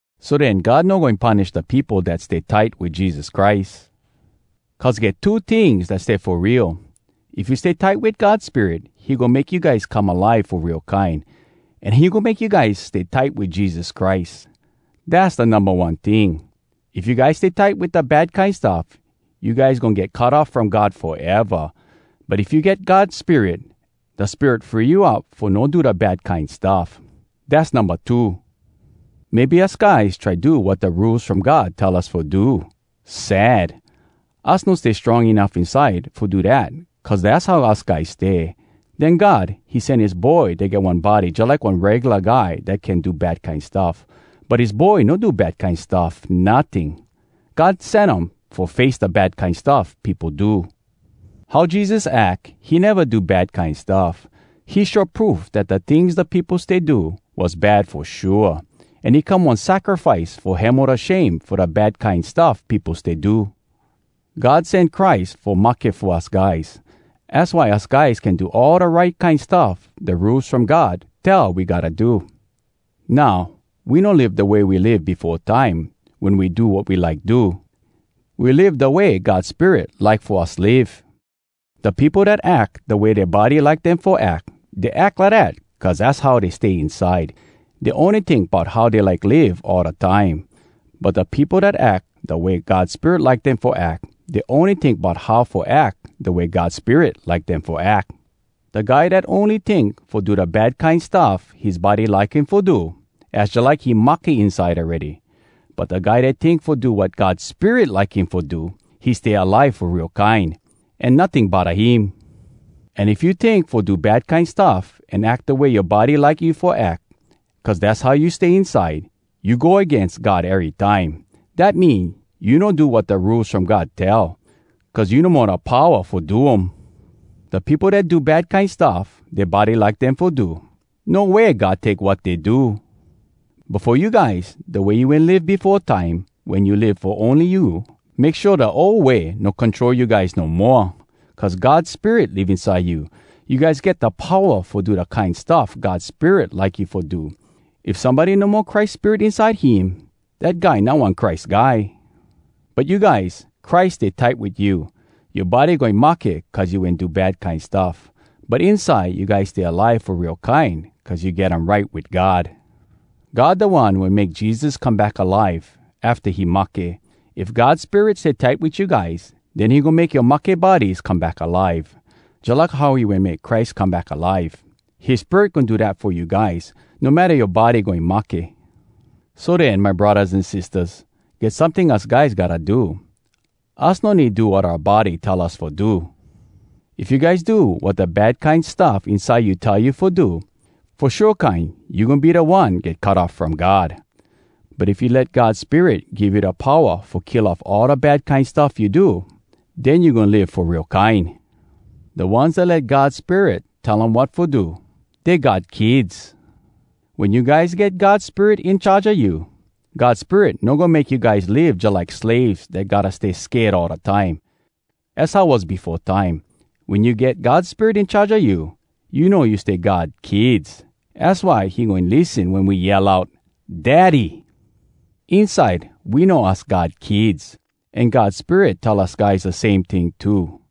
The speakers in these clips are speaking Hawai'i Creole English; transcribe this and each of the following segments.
So den, God no goin punish da peopo dat stay tight wit Jesus Christ! Cuz get two tings dat stay fo real: If you stay tight wit God Spirit, he goin make you guys come alive fo real kine. An he goin make you guys stay tight wit Jesus Christ. Dass da Numba One ting. If you guys stay tight wit da bad kine stuff, you guys goin get cut off from God foeva. But if you get God Spirit, da Spirit free you up fo no do da bad kine stuff. Dass Numba Two. Maybe us guys try do wat da Rules from God tell us fo do. Sad! Us no stay strong enuff inside fo do dat cuz dass how us guys stay. Den God, he sen his Boy dat get one body jalike one regula guy dat can do bad kine stuff, but his Boy no do bad kine stuff notting! God sen um fo face da bad kine stuff peopo do. How Jesus ack, he neva do bad kine stuff. He show proof dat da tings da peopo stay do was bad fo shua. An he come one sacrifice fo hemo da shame fo da bad kine stuff peopo stay do. God sen Christ fo mahke fo us guys. Az why us guys can do all da right kine stuff da Rules From God tell we gotta do. Now, we no live da way we live befo time wen we do wat we like do. We live da way God Spirit like fo us live. Da peopo dat ack da way dea body like dem fo ack, dey ack lidat cuz dass how dey stay inside. Dey ony tink bout how dey like live all da time. But da peopo dat ack da way God Spirit like dem fo ack, dey ony tink bout how fo ack da way God Spirit like dem fo ack. Da guy dat ony tink fo do da bad kine stuff his body like him fo do, az jalike he mahke inside awready. But da guy dat tink fo do wat God Spirit like him fo do, he stay alive fo real kine, an notting bodda him. An if you tink fo do bad kine stuff an ack da way yoa body like you fo ack, cuz dass how you stay inside, you go agains God erytime. Dat mean, you no do wat da Rules From God tell—cuz you no mo da powa fo do um. Da peopo dat do bad kine stuff dea body like dem fo do, no way God take wat dey do. But fo you guys, da way you wen live befo time, wen you live fo ony you, make shua da ol way no control you guys no moa. Cuz God Spirit live inside you, you guys get da powa fo do da kine stuff God Spirit like you fo do. If somebody no mo Christ Spirit inside him, dat guy not one Christ Guy. But you guys, Christ stay tight wit you. Yoa body goin mahke cuz you wen do bad kine stuff. But inside, you guys stay alive fo real kine cuz you get um right wit God. God da One wen make Jesus come back alive afta he mahke. If God Spirit stay tight wit you guys, den he goin make yoa mahke bodies come back alive, jalike how he wen make Christ come back alive. His Spirit goin do dat fo you guys, no matta yoa body goin mahke. So den, my braddahs an sistahs, get someting us guys gotta do. Us no need do wat oua body tell us fo do. If you guys do wat da bad kine stuff inside you tell you fo do, fo shua kine you goin be da one get cut off from God! But if you let God Spirit give you da powa fo kill off all da bad kine stuff you do, den you goin live fo real kine. Da ones dat let God Spirit tell um wat fo do, dey God kids. Wen you guys get God Spirit in charge a you, God Spirit no goin make you guys live jalike slaves dat gotta stay sked all da time. Az how was befo time. Wen you get God Spirit in charge a you, you know you stay God kids! Az why he goin lissen wen we yell out, “Daddy!” Inside we know us God kids. An God Spirit tell us guys da same ting too,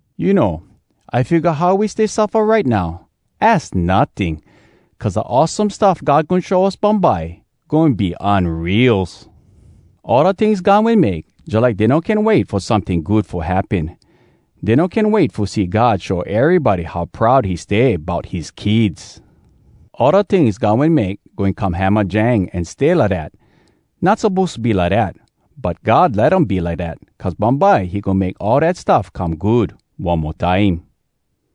You know, I figga how we stay suffa right now, az notting! Cuz da awesome stuff God goin show us bumbye, goin be unreals! All da tings God wen make, jalike dey no can wait fo someting good fo happen. Dey no can wait fo see God show erybody how proud he stay bout his kids. All da tings God wen make goin come hamajang an stay lidat. Not suppose to be lidat, but God let um be lidat cuz bumbye he goin make all dat stuff come good one mo time.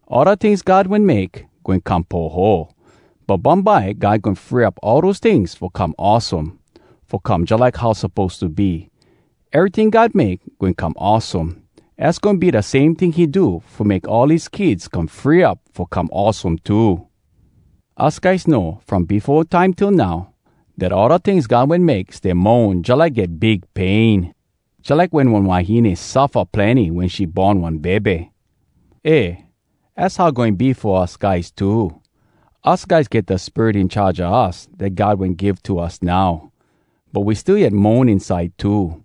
All da tings God wen make goin come poho. But bumbye, God goin free up all dose tings fo come awesome, fo come jalike how suppose to be. Eryting God make goin come awesome. Az goin be da same ting he do fo make all his kids come free up fo come awesome too. Us guys know, from befo time till now, dat all da tings God wen make stay moan jalike get big pain, jalike wen one wahine suffa plenny wen she born one bebe. Eh, az how goin be fo us guys too. Us guys get da Spirit in charge a us dat God wen give to us now. But we still yet moan inside too.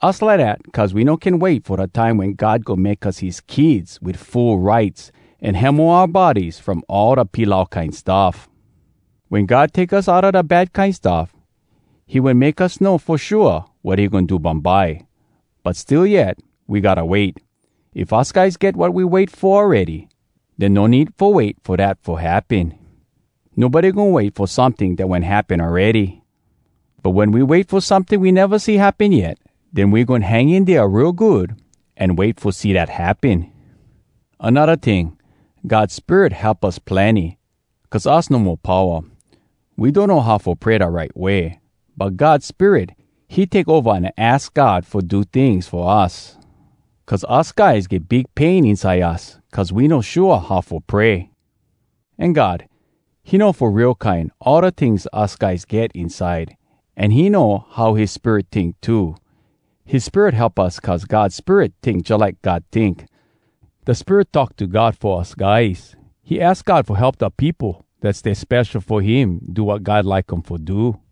Us lidat cuz we no can wait fo da time wen God goin make us his kids wit full rights, an hemo oua bodies from all da pilau kine stuff. Wen God take us outa da bad kine stuff, he wen make us know fo shua wat he goin do bumbye. But still yet, we gotta wait. If us guys get wat we wait fo awready, den no need fo wait fo dat fo happen. Nobody goin wait fo someting dat wen happen awready. But wen we wait fo someting we neva see happen yet, den we goin hang in dea real good an wait fo see dat happen. Anodda ting, God Spirit help us plenny, cuz us no mo powa. We donno how fo pray da right way. But God Spirit, he take ova an aks God fo do tings fo us. Cuz us guys get big pain inside us cuz we no shua how fo pray. An God, he know fo real kine all da tings us guys get inside, an he know how his Spirit tink too. His Spirit help us cuz God Spirit tink jalike God tink. Da Spirit talk to God fo us guys. He aks God fo help da peopo dat stay spesho fo him do wat God like um fo do.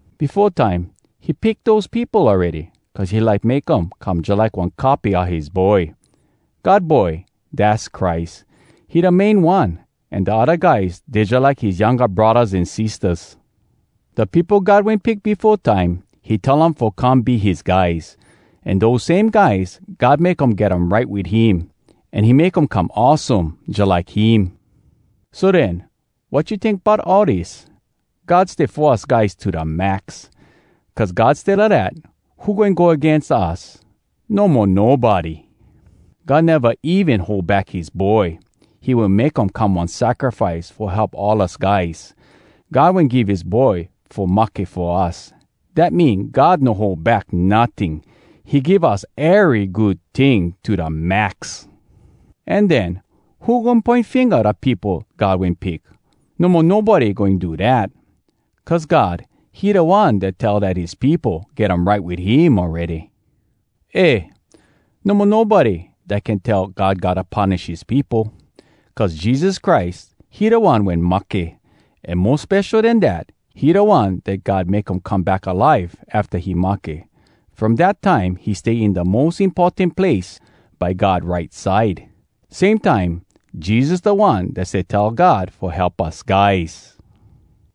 Befo time, he pick dose peopo awready, cuz he like make um come jalike one copy a his Boy. God Boy, dass Christ. He da main one, an da odda guys, dey jalike his younga braddahs an sistahs. Da peopo God wen pick befo time, he tell um fo come be his guys. An dose same guys, God make um get um right wit him, an he make um come awesome jalike him. So den, wat you tink bout all dis? God stay fo us guys to da max. Cuz God stay lidat, who goin go agains us? No mo nobody! God neva even hold back his Boy. He wen make um come one sacrifice fo help all us guys. God wen give his Boy fo mahke fo us. Dat mean God no hold back notting. He give us ery good ting to da max! An den, who goin poin finga da peopo God wen pick? No mo nobody goin do dat! Cuz God, he da One dat tell dat his peopo get um right wit him awready. Eh! No mo nobody dat can tell God gotta punish his peopo. Cuz Jesus Christ, he da One wen mahke. An mo spesho den dat, he da One dat God make um come back alive afta he mahke. From dat time, he stay in da mos importan place, by God right side. Same time, Jesus da One dat stay tell God fo help us guys!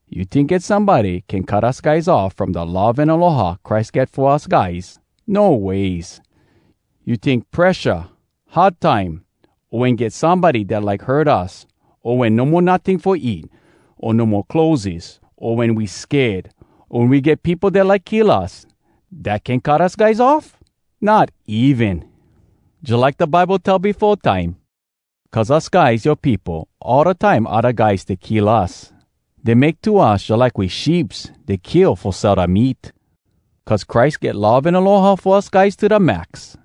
You tink get somebody can cut us guys off from da love an aloha Christ get fo us guys? No ways! You tink presha, hard time, o wen get somebody dat like hurt us, o wen no mo notting fo eat, o no mo clotheses, o wen we sked, o wen we get peopo dat like kill us, dat can cut us guys off? Not even! Jalike da Bible tell befo time, “Cuz us guys, yoa peopo, all da time odda guys stay kill us. Dey make to us jalike we sheeps dey kill fo sell da meat.” Cuz Christ get love an aloha fo us guys to da max,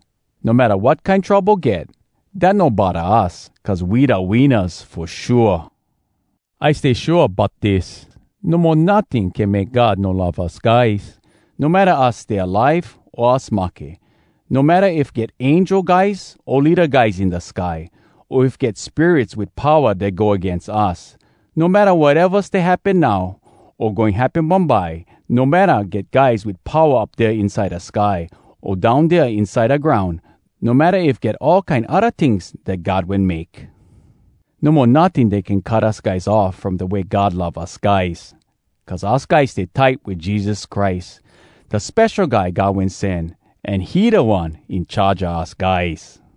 no matta wat kine trouble get, dat no bodda us, cuz we da winnas fo shua! I stay shua bout dis: No mo notting can make God no love us guys. No matta us stay alive o us mahke, no matta if get angel guys o leada guys in da sky, o if get spirits wit powa dat go agains us, no matta wateva stay happen now o goin happen bumbye, no matta get guys wit powa up dea inside da sky, o down dea inside da groun, no matta if get all kine odda tings dat God wen make. No mo notting dat can cut us guys off from da way God love us guys! Cuz us guys stay tight wit Jesus Christ, da Spesho Guy God Wen Sen, an he Da One In Charge a us guys.